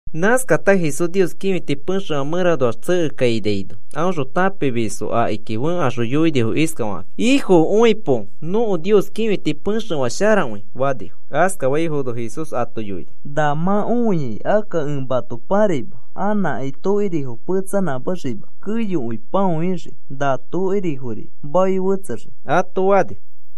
Nãskata Jesús Nios kĩfiti pexefã mẽranoax tsekekainaino, aõxõ tãpimisfo akiki fẽkaxõ yoinifo iskafakakĩ: “Ifo, õipo. Nõko Nios kĩfiti pexefã sharakõi,” fanifo. Askafaifono Jesús ato yoini: “Na mã õiai, akka ẽ mato pãraima anãkai tokirifo petsanãmẽxima, keyokõi pãoixii. Na tokirifori maoi fetsexii,” ato fani.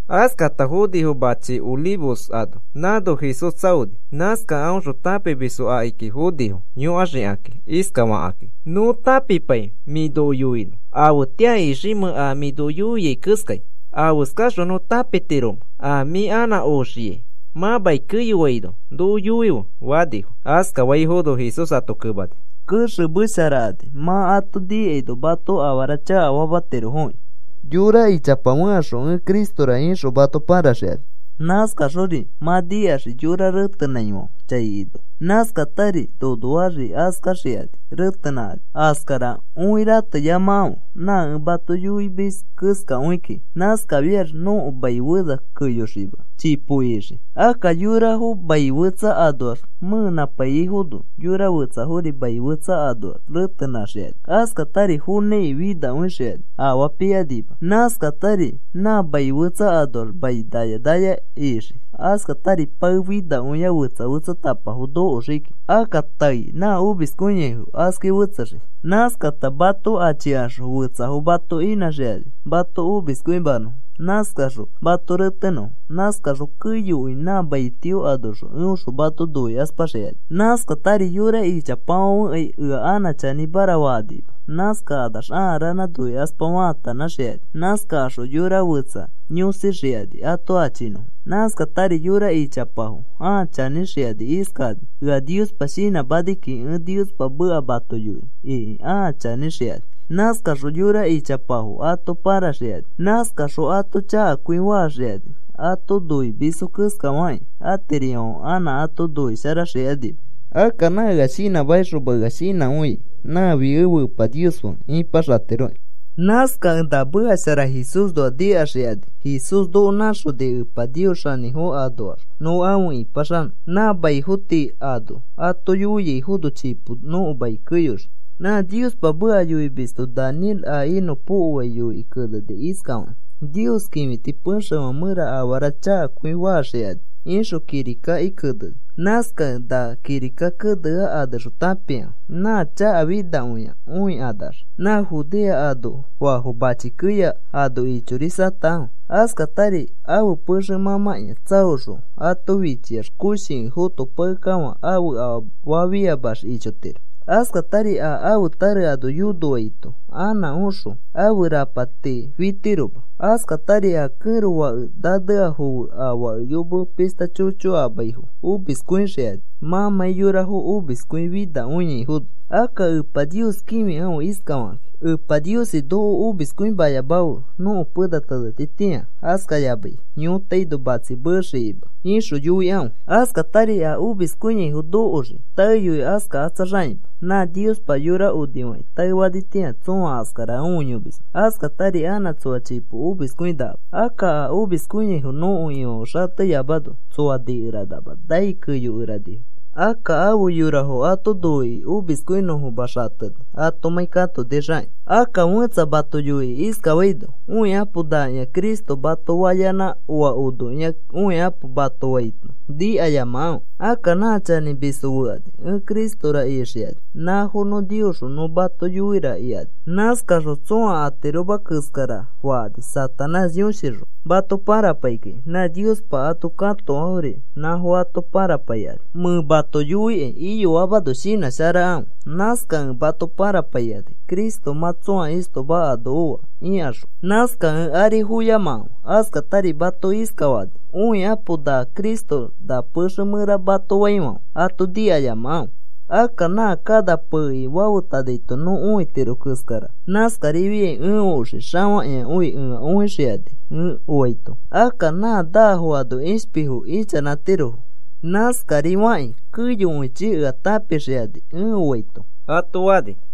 Askata fonifo mãchifã Olivos ano. Nãno Jesús tsaoni. Nãskakẽ aõxõ tãpimisfo akiki fonifo yõkaxikakĩ iskafakakĩ: “Nõ tãpipai mĩ noko yoinõ afetĩa iximẽ a mĩ yoiai keskai. Afeskaxõ nõ tãpitiromẽ a mĩ anã oxiai mã mai keyoaino noko yoife,” fanifo. Askafaifono Jesús ato kemani: “Kexemesharakani mã ato nikaino mato afara chakafamatirofoki. Yora ichapa fẽkaxõ, ‘Ẽ Cristora,’ ixõ mato paraxikani. Nãskaxori mã nikaxii yorafo retenãifãfe chai inoax. Nãskatari nonoaxri askaxikani retenãkani. Askara õi, rateyamakãfe. Nã ẽ mato yoimis keskakõi kiki. Nãskafiax nõko mai fena keyoxima kiki, chipo ixii. Akka yorafo mai fetsa anoax mẽenãpaiyaifono yora fetsafori mai fetsa anoax retenãxikani. Askatari fonãiki finakõixikani afaa pikanima. Nãskatari nã mai fetsa anoax mai naya naya ixii. Askatari pae finakõia fetsa fetsatapafo nokoxii kiki. Akka taei nã omiskõiaifo, askai fetsexii. “Nãskata mato achikaxõ fetsafo mato inãxikani mato omiskõimanõfo. Nãskaxõ mato retenõfo. Nãskaxõ keyokõi nã mai tio anoxõ eõxõ mato noikaspaxikani. Nãskatari yora ichapafãfekai ea anã chanĩmara fakanima. Nãskakanax ãa ranã noikaspa faatanãxikani. Nãskakaxõ yora fetsa yõsixikani ato achinõfo. Nãskatari yora ichapafo ãa chanĩxikani iskakani: ‘Ea Niospa shinãmani kiki ẽ Niospa meka mato yoinõ,’ iki ãa chanĩxikani. Nãskaxõ yora ichapafo ato pãraxikani. Nãskaxõ ato chakakõi faxikani. Ato noimisfo keskafakĩ atirififãfe anã ato noisharaxikanima. Akka nã ea shinãmakixoma ea shinãkõiai nãfi ẽfe Epa Nios fe ipaxatiroki. Nãskakẽ na meka shara Jesúsnoa nikaxakani Jesús noko nãxonikẽ Epa Nios xanĩfo anoax nõ afe ĩpaxanõ. Na maifo tii ano ato yoiaifono, chipo nõko mai keyoxii. “Nã Niospa meka yoimisto Daniel a inõpokoai yoikĩ keneni iskafakĩ: ‘Nios kĩfiti pexefã mẽra afara chakakõi faxikani,’ ixõ kirika keneni. Nãskakẽ na kirika kenea anexõ tãpikãfe. Nã chakafinakõia õikanax, nã Judea anoafo machi keya ano ichorisatakãfe. Askatari ãfe pexe mãmãkĩa tsaoxõ ato fichiax koshikõi fotopakekafã ãfe afaa fiamax ichotiro. Askatari a ãfe tare ano yonoaito anã oxõ ãfe rapati fitiroma. Askatari a kẽro fake naneafo fe a fake yome pishta chocho amaifo omiskõixikani mãmãi yorafo omiskõifinakõiaifono. Akka Epa Nios kĩfikãfe iskafakĩ: ‘Epa Niosi, noko omiskõimayamafe nõko pena tenetitĩa askayamai yõtaino matsi meexikakĩma,’ ixõ yoikãfe. Askatari a omiskõiaifo nokoxii, taeyoi askakatsaxakĩma. Nã Niospa yora onifakĩ taefanitĩa tsõa askara õiyomisma. Askatari anã tsoa chipo omiskõinakama. Akka a omiskõiaifo nõko Ifãfe xateyamano, tsoa nikeranama nai keyokeranifo. Akka afe yorafo ato noikĩ omiskõinõfoma xateni atomãi katonixakĩ. “Akka fẽtsa mato yoikĩ iskafaino: ‘Õikapo, nakĩa Cristo,’ mato fayanã, ‘Oa onokĩa, õikapo,’ mato faito nikayamakãfe. Akka nã chanĩmisfo fekani, ẽ Cristora ixikani, nãfo nõ Niosxõ nõ mato yoira ikani. Nãskakaxõ tsõa atiroma keskara fakani Satanás yõshixõ mato parapaikakĩ. Nã Niospa ato katoafori nãfo ato parapaikani. Mẽ mato yoikai iyoamano shinãsharakãfe. Nãskakẽ mato parapaikani: ‘Cristo mã tsõa istoma ano oa,’ ikaxõ. Nãskakẽ ari foyamakãfe. Askatari mato iskafakani: ‘Õikapo, na Cristo na pexe mẽra,’ mato faifãfe ato nikayamakãfe. Akka nã kana peikĩ fafetanaito nõ õitiro keskara, nãskarifiai ẽ oxii xafakĩakõi ea õixikani ẽ oaito. Akka nã naafo ano ishpifo ichanãtiro. Nãskari fakĩ keyokõichi ea tãpixikani ẽ oaito,” ato fani.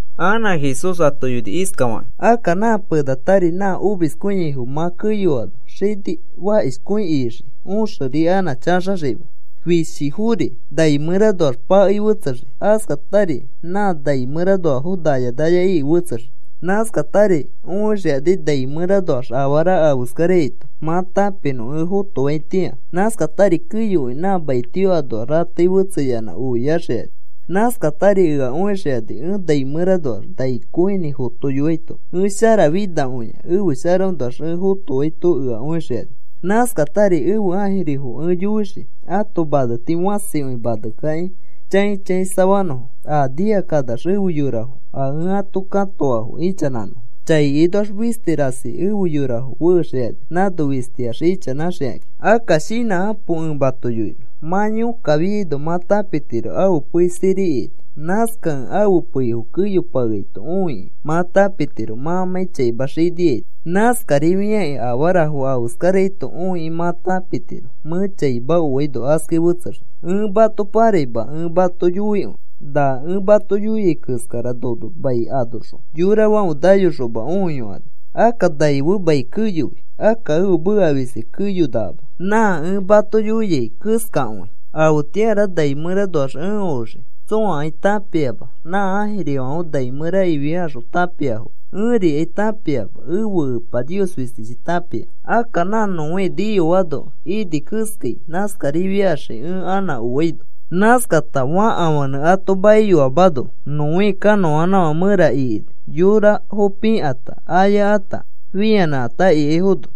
Anã Jesús ato yoini iskafakĩ: “Akka nã penatari, nã omiskõiaifo mã keyoano, xini fakishkõi ixii, õxeri anã chaxaxima. Fishifori nai mẽranoax pakei fetsexii, askatari nã nai mẽranoafo naya naya iki fetsexii. Nãskatari õixikani nai mẽranoax afara afeskaraito mã tãpinõ ẽ fotoaitĩa. Nãskatari keyokõi nã maitio anoax ratei fetseyanã oiaxikani. Nãskatari ea õixikani ẽ nai mẽranoax nai kõinĩ fotoiyoaito. Ẽ sharafinakõia ẽfe sharaõnoax ẽ fotoaito ea õixikani. Nãskatari ẽfe ãjirifori ẽ yoixii ãto maneti fãsikõi manekakĩ chãi chãisafanõfo a nikakanax efe yorafo a ẽ ato katoa ichanãnõfo. Chai inoax fisti rasi efe yorafo fexikani nãno fistiax ichanãxikakĩ. “Akka shinãkapo ẽ mato yoinõ. Mã yõkkafiaino mã tãpitiro ãfe pei sirikiaito. Nãskakẽ ãfe peifo keyopakeaito õikĩ mã tãpitiro mãmãi chaima xiniaito. Nãskarifiakĩ afarafo afeskaraito õikĩ mã tãpitiro mẽ chaima oaino askai fetsexii. Ẽ mato pãraima ẽ mato yoikõi, na ẽ mato yoiai keskara nono mai anoxõ yorafãfe nayokaxoma õiyokani. Akka nai fe mai keyoi. Akka ẽfe meka fisti keyonakama, nã ẽ mato yoiai keskakõi. “Afetĩara nai mẽranoax ẽ oxii tsõakai tãpiama. Nã ãjirifãfe nai mẽra ifiakaxõ tãpiafoma. Ẽrikai tãpiama. Ẽfe Epa Nios fistichi tãpia. Akka nã Noé niyoano ini keskai, nãskarifiaxii ẽ anã oaino. Nãskata fakafãnẽ ato maiyoamano, Noé kanõanãfã mẽra ikini, yorafo pikãta, ayakãta fĩanãkãta ikaifono.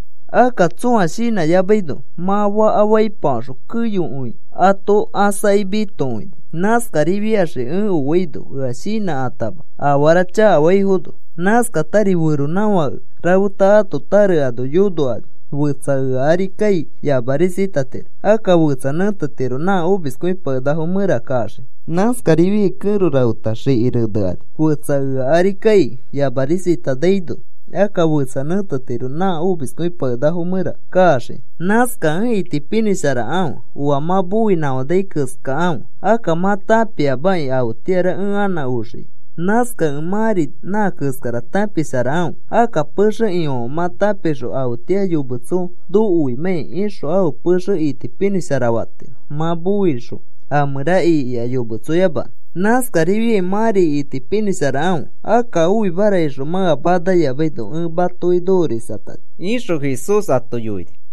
Akka tsõa shinãyamaino mã faka faipafaxõ keyokõi ato ãsakĩ mitokõini. Nãskarifiaxii ẽ oaino ea shinãtama afara chakafaifono. Nãskatari feronãfake rafeta ãto tare ano yonokani. Fetsa ea ari kai yamarisatatiro. Akka fetsa nẽtetiro nã omiskõipakenakafo mẽra kaxiki. Nãskarifiai kẽro rafeta xiki renekani. Fetsa ea ari kai yamarisatanaino akka fetsa nẽtetiro nã omiskõipakenakafo mẽra kaxiki. “Nãskakẽ itipinĩsharakãfe oa mã moinãkafanai keskakãfe. Akka mã tãpiamaki afetĩara ẽ anã oxikai. Nãskakẽ mãri nã keskara tãpisharakãfe. Akka pexe ifãfe mã tãpixõ afetĩa yometso nokoimãkai ixõ ãfe pexe itipinĩshara fatiro mã moixõ, a mẽra ikiax yometsoyamanõ. Nãskarifiai mãri itipinĩsharakãfe. Akka oimara ixõ mã ea manayamaino ẽ matoki nokorisatani,” ixõ Jesús ato yoini.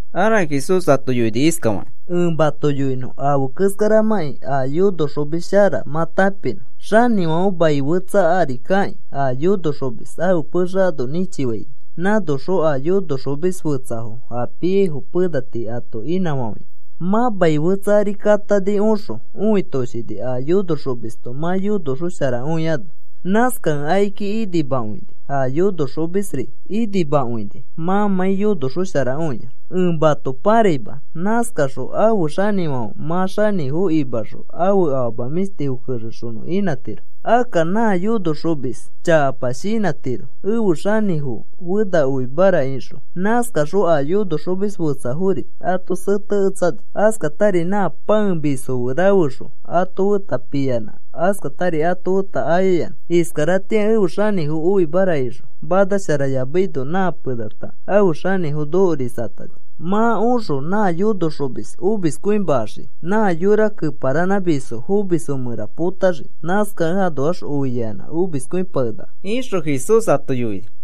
Anã Jesús ato yoini iskafakĩ: “Ẽ mato yoinõ afe keskaramãkĩ a yonoxomis shara mã tãpinõ. Xanĩfãfe mai fetsa ari kakĩ, a yonoxomis ãfe pexe ano nĩchifaini nãnoxõ a yonoxomis fetsafo a piaifo pena tii ato inãfafainõ. Mã mai fetsa ari katani oxõ õitoshini a yonoxomisto mã yonoxosharakõiano. Nãskakẽ akiki inimakõini a yonoxomisri inimakõini mãmãi yonoxosharakõiax. Ẽ mato paraima. Nãskaxõ ãfe xanĩfãfe mã xanĩfo imaxõ ãfe afama mĩshtifo kexexonõ inãtiro. Akka nã yonoxomis chakapa shinãtiro: ‘Ẽfe xanĩfo fena oimara,’ ixõ. Nãskaxõ a yonoxomis fetsafori ato seteketsani. Askatari nã pãemisfo fe rafexõ ato feta piyanã askatari ato feta ayayanã. Iskaratĩa ẽfe xanĩfo oimara ixõ manasharayamaino nã penata ãfe xanĩfo nokorisatani. Mã oxõ nã yonoxomis omiskõimaxii. Nã yora keparanãmisfo fomisfo mẽra potaxii. Nãskakẽ anoax oiaiyanã omiskõipakenaka,” ixõ Jesús ato yoini.